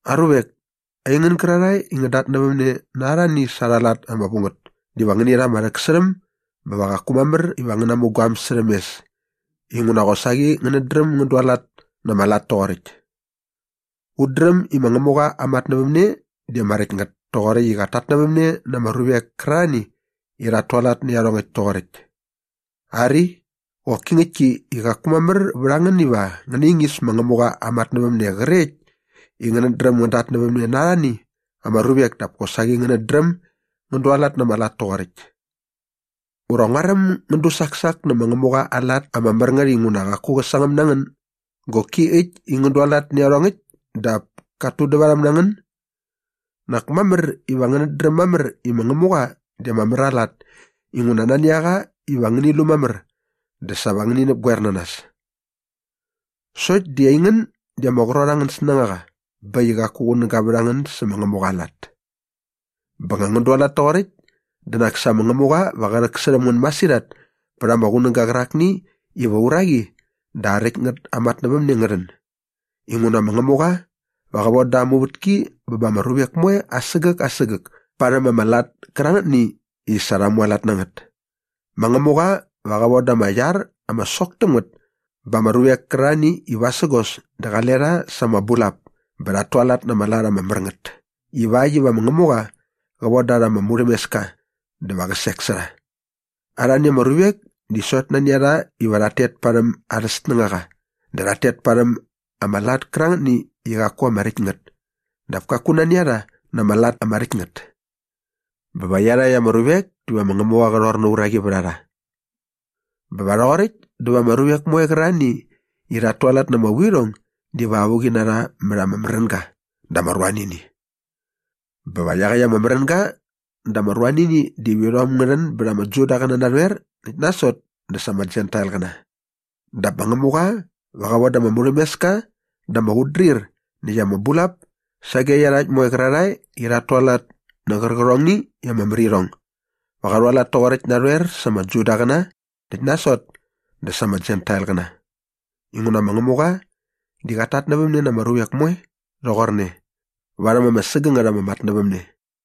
Aruvek, aingän gärarhae i ngän datnävämne na arhani sa arha lat ama vu ngät diva ngäni rha ama rhäksärhäm bä va qaku mamär iva ngän namu guaäm särhäm mes inguna qosaqi ngänät dräm ngän dualat na ama lat toqoräkt. Ut dräm i ma Ngämuqa aa matnävämne di ama räkt ngät toqoräkt i qat tatnävämne na ama ruvek kärarhani i rhat tualat nä iarhongäkt toqoräkt. Ari, qoki ngäktki i qaku mamär vät a ngän iva ngän naingis ma Ngämuqa aa matnävämne qrekt i ngänät dräm ngän datnävämne na arhani ama ruvek dap kosaqi ngänät dräm ngän dualat na ama lat toqoräkt. Ura nguaräm ngän dusaksak nä ma Ngämuqa aa lat ama mär ngät inguna qaku qä sangäm na ngän goki äkt i ngän dualat nä iarhongäkt dap kat tudävarhäm na ngän? Nak mamär iva ngänät dräm mamär i ma Ngämuqa di ama mär aa lat inguna nani a qa iva ngäni lu mamär dä sa va ngäni näpgoer na nas. Sokt di aingän di ama qrot angän snängaqa bä äkt i qaku qunäga vät a ngän sä ma Ngämuqa aa lat. Bä nga ngän dualat toqoräkt dä nak sa ma Ngämuqa va qä rhäksärhäm ngän masirhat pät ama qunäga qärakni iva aa uraqi dä aa räkt ngät aa matnävämne ngä rhän. Inguna ma Ngämuqa va qä von da aa muvätki bä ba ama ruvek moe asägäk asägäk parhäm ama lat kärangätni i sa rha mualat na ngät. Ma Ngämuqa va qä von da ama iar ama sok täm ngät ba ama ruvek kärarhani i vasägos dä qale rha sa ama bulap bä rhat tualat na ama lat ama mär ngät ivakt iva ma Ngämuqa qä von da rha ama murhämeska dä va qä sek sä rha. Arhani ama ruvek di sokt nani a rha iva rhat tet parhäm arhä snängaqa dä rhat tet parhäm ama lat kärangätni i qaku ama räkt ngät dap kaku nani a rha na ama lat ama räkt ngät. Bä va iarhakt ama ruvek diva ma Ngämuqa qä rhor na aa uraqi vät a rha. Bä va rhoqoräkt dä va ama ruvek moe qärarhani i rhat tualat na ama vuirhong diva avuqi na rha mät ama märänga dä ama ruanini. Bä va iaqäkt ama märänga dä ama ruanini diva irhom ngä rhän bät ama Judaqäna narhoer näkt nasot dä sa ama Jentailqäna. Dap ma Ngämuqa va qä von da ama murhämeska dä ama qutdrir näkt ama bulap sage iarhakt moe qärarhae i rhat tualat nä qärqärhongni i ama mär irhong. Va qa rhualat toqoräkt narhoer sa ama Judaqäna näkt nasot dä sa ama Jentailqäna. Inguna ma Ngämuqa di qat tatnävämne na ama ruvek moe rhoqorne varhäm ama sägängät ama matnävämne.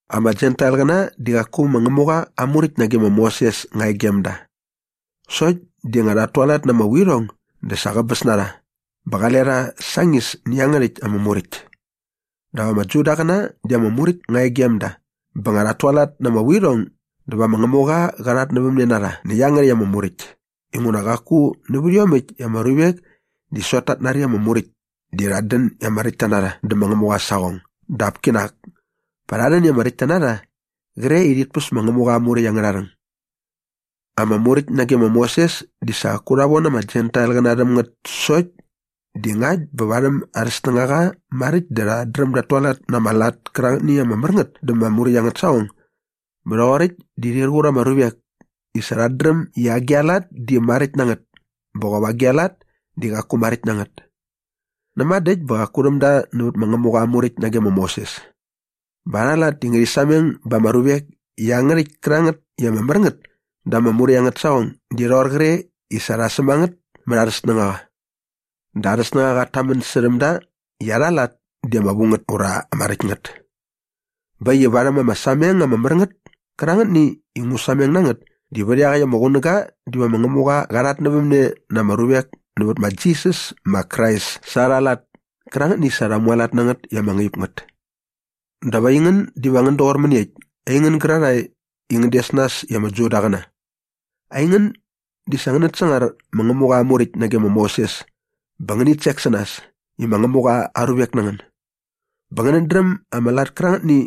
Ama Jentailqäna di qaku ma Ngämuqa aa Muräkt nage ma Moses nga e gem da. Sokt di nga rhat tualat na ama vuirhong dä sa qäbäs na rha bä qale rha sañis nä iangärhäkt ama Muräkt. Dap ama Judaqäna di ama Muräkt nga e gem da bä nga rhat tualat na ama vuirhong dä va ma Ngämuqa qa rhatnävämne na rha nä iangärhäkt ama Muräkt inguna qaku nävät iomäkt i ama ruvek di sokt tat nari ama Muräkt di rhat dän i ama räktta na rha dä ma Ngämuqa aa saqong dap kinak pa rha rhän i ama räktta na rha qre i rhit päs ma Ngämuqa aa Muräkt angärha rhäng. Ama Muräkt nage ma Moses di sa qaku rha von ama Jentailqäna rhäm ngät sokt di ngakt bä varhäm arhä snängaqa maräkt dä rhat dräm dat tualat na ama lat kärangätni i ama mär ngät da ama Muräkt angät saqong bä rhoqoräkt di rhir qur ama ruvek i sa rhat dräm i agi a lat di maräkt na ngät bä qop agi a lat di qaku maräkt na ngät. Näma dä äkt bä qaku rhäm da nävät ma Ngämuqa aa Muräkt nage ma Moses. Bä arha lat di ngärhi sameng ba ama ruvek i iangärhäkt kärangät i ama mär ngät da ama Muräkt angät saqong di rhoqor qre i sa rha säm a ngät mät arhä snängaqa. Dä arhä snängaqa qat tamän särhäm da i arha lat di ama vu ngät ura ama räkt ngät. Bä äkt i varhäm ama sameng ama mär ngät kärangätni i ngu sameng na ngät di vät iaqäkt ama qunäga diva ma Ngämuqa qa rhatnävämne na ama ruvek nävät ma Jisas ma Krais sa arha lat kärangätni i sa rha mualat na ngät i ama ngaip ngät. Dap aingän diva ngän doqor mäniekt, aingän gärarhae i ngän des nas i ama Judaqäna? Aingän di sa ngänät sangar ma Ngämuqa aa Muräkt nage ma Moses bä ngänit sek na nas i ma Ngämuqa aa ruvek na ngän bä ngänät dräm ama lat kärangätni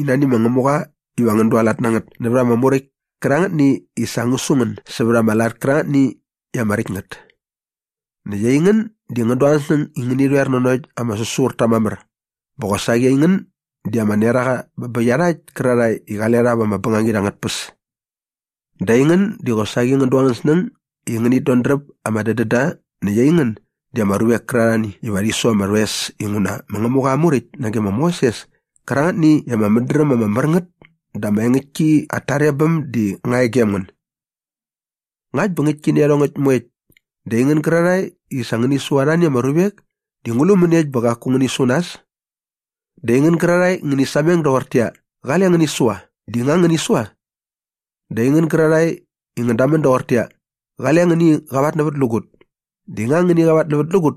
i nani ma Ngämuqa iva ngän dualat na ngät nävät ama Muräkt kärangätni i sa ngä su ngän sävät ama lat kärangätni i ama räkt ngät. Näkt aingän di ngän du angän snäng i ngäni rhoer nanokt ama säsurta mamär bä qosaqi aingän di ama neraqa bä bä iarhakt kärarhae i qale rha vä bängangit angät tpäs. Dä aingän di qosaqi ngän du angän snäng i ngänit dodräp ama dädända näkt aingän di ama ruvek kärarhani iva rhi su ama rhoes inguna ma Ngämuqa aa Muräkt nage ma Moses kärangätni i ama mädräm ama mär ngät dä ama engäktki at tarebäm di nga e gem ngän. Ngakt bä ngäktki nä iarhongäkt moekt dä aingän gärarhae i sa ngäni su arhani ama ruvek di ngu lu mäniekt bä qaku ngäni su nas? Dä aingän gärarhae i ngäni sameng doqortäqyia, “Qale ngäni sua” di nga ngäni sua? Dä aingän gärarhae i ngän damän doqortäqyia, “Qale ngäni qavatnävätlägut” di nga ngäni qavatnävätlägut?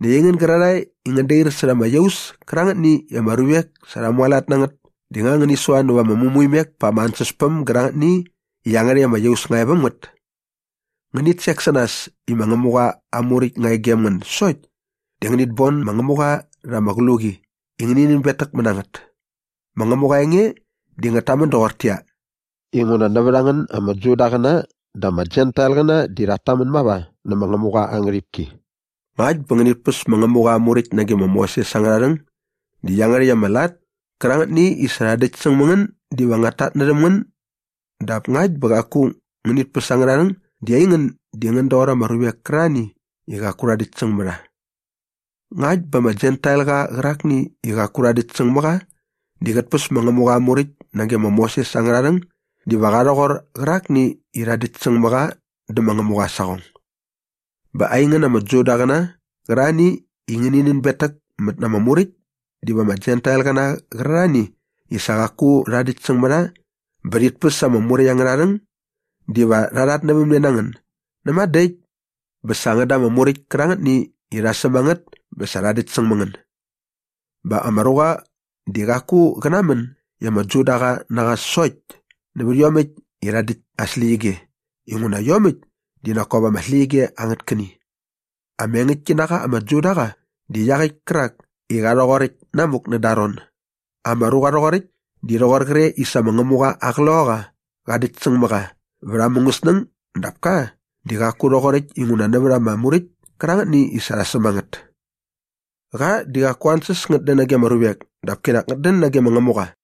Näkt aingän gärarhae i ngän dair särha ama iaus kärangätni i ama ruvek sa rha mualat na ngät di nga ngäni sua nävät ama mämuimek pa ama ansäspäm gärangätni i iangärhäkt ama iaus nga e väm ngät? Ngänit sek na nas i ma Ngämuqa aa Muräkt nga e gem ngän sokt di ngänit bon ma Ngämuqa rha ama qluqi i ngäni nänbetäkmät na ngät. Ma Ngämuqa aa enge di ngät tamän doqortäqyia, “Inguna nävät a ngän ama Judaqäna dä ama Jentailqäna di rhat tamän mava nä ma Ngämuqa aa ngärhipki.” Ngakt bä ngänit päs ma Ngämuqa aa Muräkt nage ma Moses angärha rhäng di iangärhäkt ama lat kärangätni i sa rha däktsäng mä ngän diva ngät tatnärhäm ngän dap ngakt bä qaku ngänit päs angärha rhäng di aingän di ngän doqor ama ruvek kärarhani i qaku rha däktsäng mä rha. Ngakt bä ama Jentailqa qärakni i qaku rha däktsäng mä qa di qät päs ma Ngämuqa aa Muräkt nage ma Moses angärha rhäng diva qa rhoqor qärakni i rha däktsäng mä qa dä ma Ngämuqa aa saqong. Bä aingän ama Judaqäna qärarhani i ngäni nänbetäkmät na ama Muräkt diva ama Jentailqäna qärarhani i sa qaku rha däktsäng mä rha bä rhit päs ama Muräkt angärha rhäng diva rha rhatnävämne na ngän näma dä äkt bä sa ngän da ama Muräkt kärangätni i rha säm a ngät bä sa rha däktsäng mä ngän. Bä ama ruqa di qaku qä namän i ama Judaqa na qa sokt nävät iomäkt i rha däkt aa släqyige inguna iomäkt di nak kop ama släqyige angät käni. Ama engäktki na qa ama Judaqa di iaqäkt kärak i qa rhoqoräkt namuk näda aa ron. Ama ruqa rhoqoräkt di rhoqor qre i sa ma Ngämuqa aa Qloqaqa qa däktsäng mä qa vät aa mungäsnäng dap ka di qaku rhoqoräkt inguna nävät ama Muräkt kärangätni i rha säm a ngät. Qa di qaku aa ansäs ngät dän nage ama ruvek dap kinak ngät dän nage ma Ngämuqa.